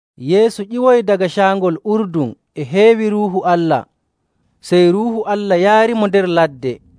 Yeesu ƴiwoyi daga Caangol Urdun e heewi Ruuhu Allah. Sey Ruuhu Allah yaarimo nder ladde.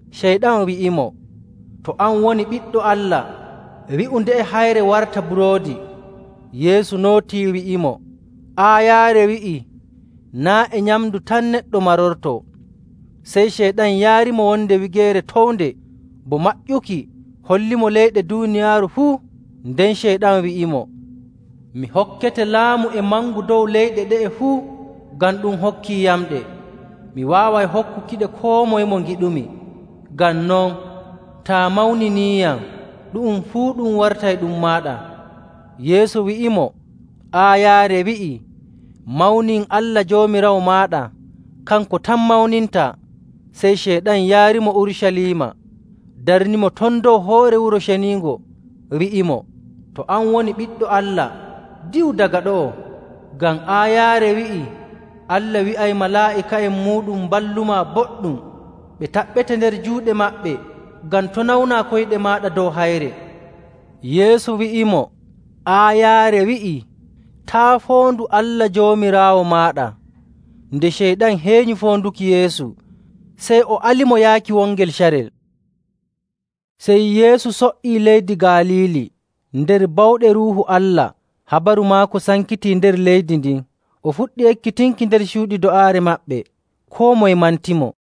Ceyɗan wi'imo, “To an woni Ɓiɗɗo Allah, wi'u nde'e hayre warta buroodi.” Yeesu nootii wi'imo, “Aayaare wi'ii, ‘Naa' e nyamndu tan neɗɗo marortoo.’”. Sey Ceyɗan yaarimo wonde wigeere townde, bo maƴƴuki hollimo leyɗe duuniyaaru fuu. Nden Ceyɗan wi'imo, “Mi hokkete laamu e mangu dow leyɗe ɗe'e fuu, ngam ɗum hokkiiyamɗe. Mi waaway hokkukiɗe koo moye mo ngiɗumi. Ngam non, taa mawniniiyam, ɗu'um fuu ɗum wartay ɗum maaɗa.” Yeesu wi'imo, “Aayaare wi'ii, ‘Mawnin Allah Joomiraawo maaɗa, kanko tan mawnintaa.’”. Sey Ceyɗan yaarimo Urucaliima, darnimo ton dow hoore Wuro Ceniingo, wi'imo, “To an woni Ɓiɗɗo Allah, diwu daga ɗo'o, ngam aayaare wi'ii, ‘Allah wi'ay malaa'ika'en muuɗum mballumaa boɗɗum. Ɓe taɓɓete nder juuɗe maɓɓe, ngam to' nawnaa koyɗe maaɗa dow hayre.’”. Yeesu wi'imo, “Aayaare wi'i, ‘Taa' foondu Allah Joomiraawo maaɗa.’”. Nde Ceyɗan heenyi foonduki Yeesu fuu, sey o alimo yaaki wongel carel. Sey Yeesu so''ii leydi Galiili nder bawɗe Ruuhu Allah. Habaru maako sankitii nder leydi ndin. O fuɗɗi ekkitinki nder cuuɗi do'aare maɓɓe, koo moye mantimo.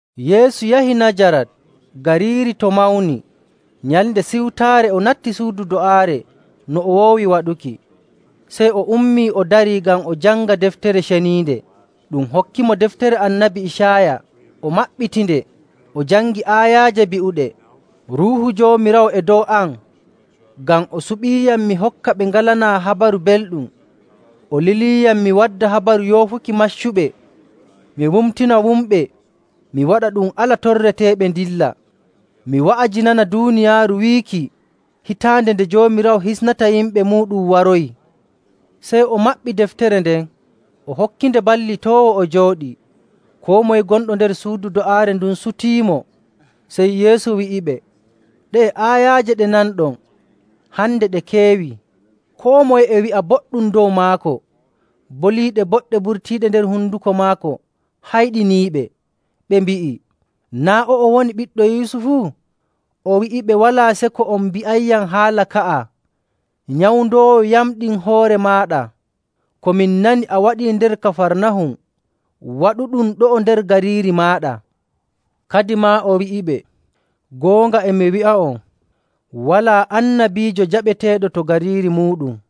Yeesu yahi Najarat, gariiri to mawni. Nyalnde Siwtaare, o natti suudu do'aare no o woowi waɗuki. Sey o ummii o darii ngam o janga Deftere Ceniinde. Ɗum hokkimo deftere Annabi Icaaya, o maɓɓitinde, o jangi aayaaje bi'uɗe, “Ruuhu Joomiraawo e dow am, ngam o suɓiiyam mi hokka ɓe ngalanaa Habaru Belɗum. O liliiyam mi wadda habaru yoofuki maccuɓe, mi wumtina wumɓe, mi waɗa ɗum ala torreteeɓe ndilla, Mi wa'ajinana duuniyaaru wiiki hitaande nde Joomiraawo hisnata yimɓe muuɗum waroyi.”. Sey o maɓɓi deftere nden, o hokkitinde ballitoowo o jooɗii. Koo moye gonɗo nder suudu do'aare ndun sutiimo. Sey Yeesu wi'iɓe, “Ɗe'e aayaaje ɗe nanɗon, hande ɗe keewii.” Koo moye e wi'a boɗɗum dow maako. Boliiɗe boɗɗe burtiiɗe nder honduko maako hayɗiniiɓe. Ɓe mbi'i, “Naa' o'o woni ɓiɗɗo Yusufu?” O wi'iɓe, “Walaa seko on mbi'ayyam haala ka'a, ‘Nyawndoowo: Waato likitaajo., yamɗin hoore maaɗa! Ko min nani a waɗii nder Kafarnahum, waɗu ɗum ɗo'o nder gariiri maaɗa.’” Kadimaa o wi'iɓe, “Goonga, e mi wi'a'on, walaa annabiijo jaɓeteeɗo to gariiri muuɗum..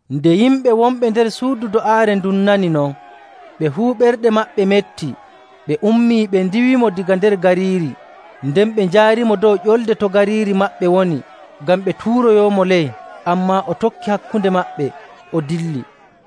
Nde yimɓe wonɓe nder suudu do'aare ndun nani non, ɓe fuu ɓerɗe maɓɓe metti. Ɓe ummii, ɓe ndiiwimo daga nder gariiri, nden ɓe njaarimo dow ƴolde to gariiri maɓɓe woni, ngam ɓe tuuroyoomo ley, ammaa o tokki hakkunde maɓɓe, o dilli.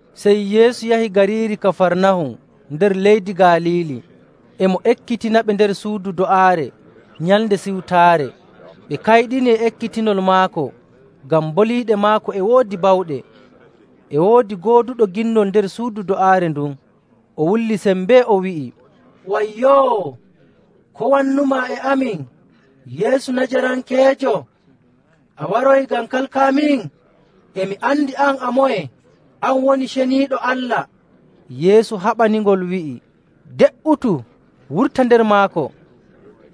Sey Yeesu yahi gariiri Kafarnahum nder leydi Galiili, e mo ekkitinaɓe nder suudu do'aare Nyalnde Siwtaare. Ɓe kayɗini e ekkitinol maako, ngam boliiɗe maako e woodi bawɗe.. E woodi gooduɗo ginnol nder suudu do'aare ndun, o wulli sembee, o wi'i, “Wayyoo! Ko wannumaa e amin, Yeesu Najarankeejo? A waroyi ngam kalkaamin? E mi andi an a moye. An woni Ceniiɗo Allah!” Yeesu haɓaningol wi'i, “De''utu! Wurta nder maako!”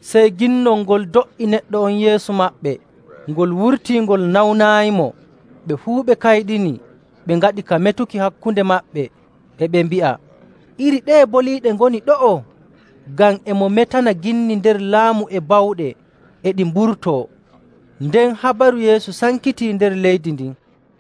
Sey ginnol ngol do''i neɗɗo on yeeso maɓɓe, ngol wurtii ngol nawnaayimo. Ɓe fuu ɓe kayɗini, ɓe ngaɗi ka metuki hakkunde maɓɓe, e ɓe mbi'a, “Iri ɗeye boliiɗe ngoni ɗo'o? Ngam e mo metana ginni nder laamu e bawɗe, e ɗi mburtoo.” Nden habaru Yeesu sankitii nder leydi ndin.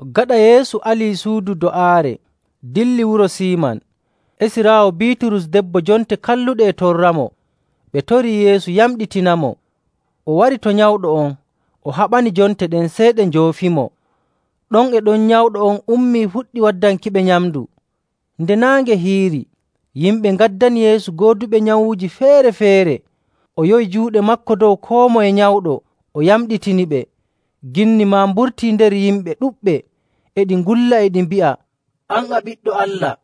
Gaɗa Yeesu alii suudu do'aare, dillii wuro Siiman. Esiraawo Biiturus debbo jonte kalluɗe e torramo, ɓe torii Yeesu yamɗitinamo. O wari to nyawɗo on, o haɓani jonte ɗen, sey ɗe njoofimo. Ɗon e ɗon nyawɗo on ummii, fuɗɗi waddankiɓe nyamndu. Nde naange hiiri, yimɓe ngaddani Yeesu gooduɓe nyawuuji feere‑feere, o yowi juuɗe maako dow koo moye nyawɗo, o yamɗitiniɓe. Ginni maa mburtii nder yimɓe ɗuɗɓe, e ɗi ngulla, e ɗi mbi'a, “An, a Ɓiɗɗo Allah!”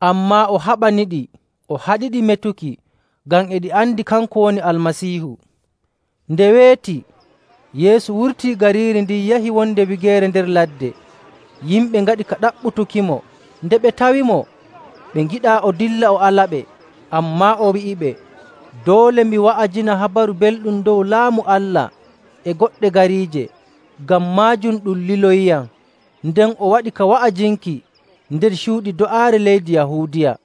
Ammaa o haɓaniɗi, o haɗiɗi metuki, ngam e ɗi andi kanko woni Almasiihu. Nde weeti, Yeesu wurtii gariiri ndin yahi wonde wigeere nder ladde. Yimɓe ngaɗi ka ɗaɓɓutukimo. Nde ɓe tawimo, ɓe ngiɗaa o dilla o alaɓe. Ammaa o wi'iɓe, “Doole mi wa'ajina Habaru Belɗum dow Laamu Allah e goɗɗe gariije, ngam maajum ɗum liloyiyam.” Nden o waɗi ka wa'ajinki nder cuuɗi do'aare leydi Yahuudiya.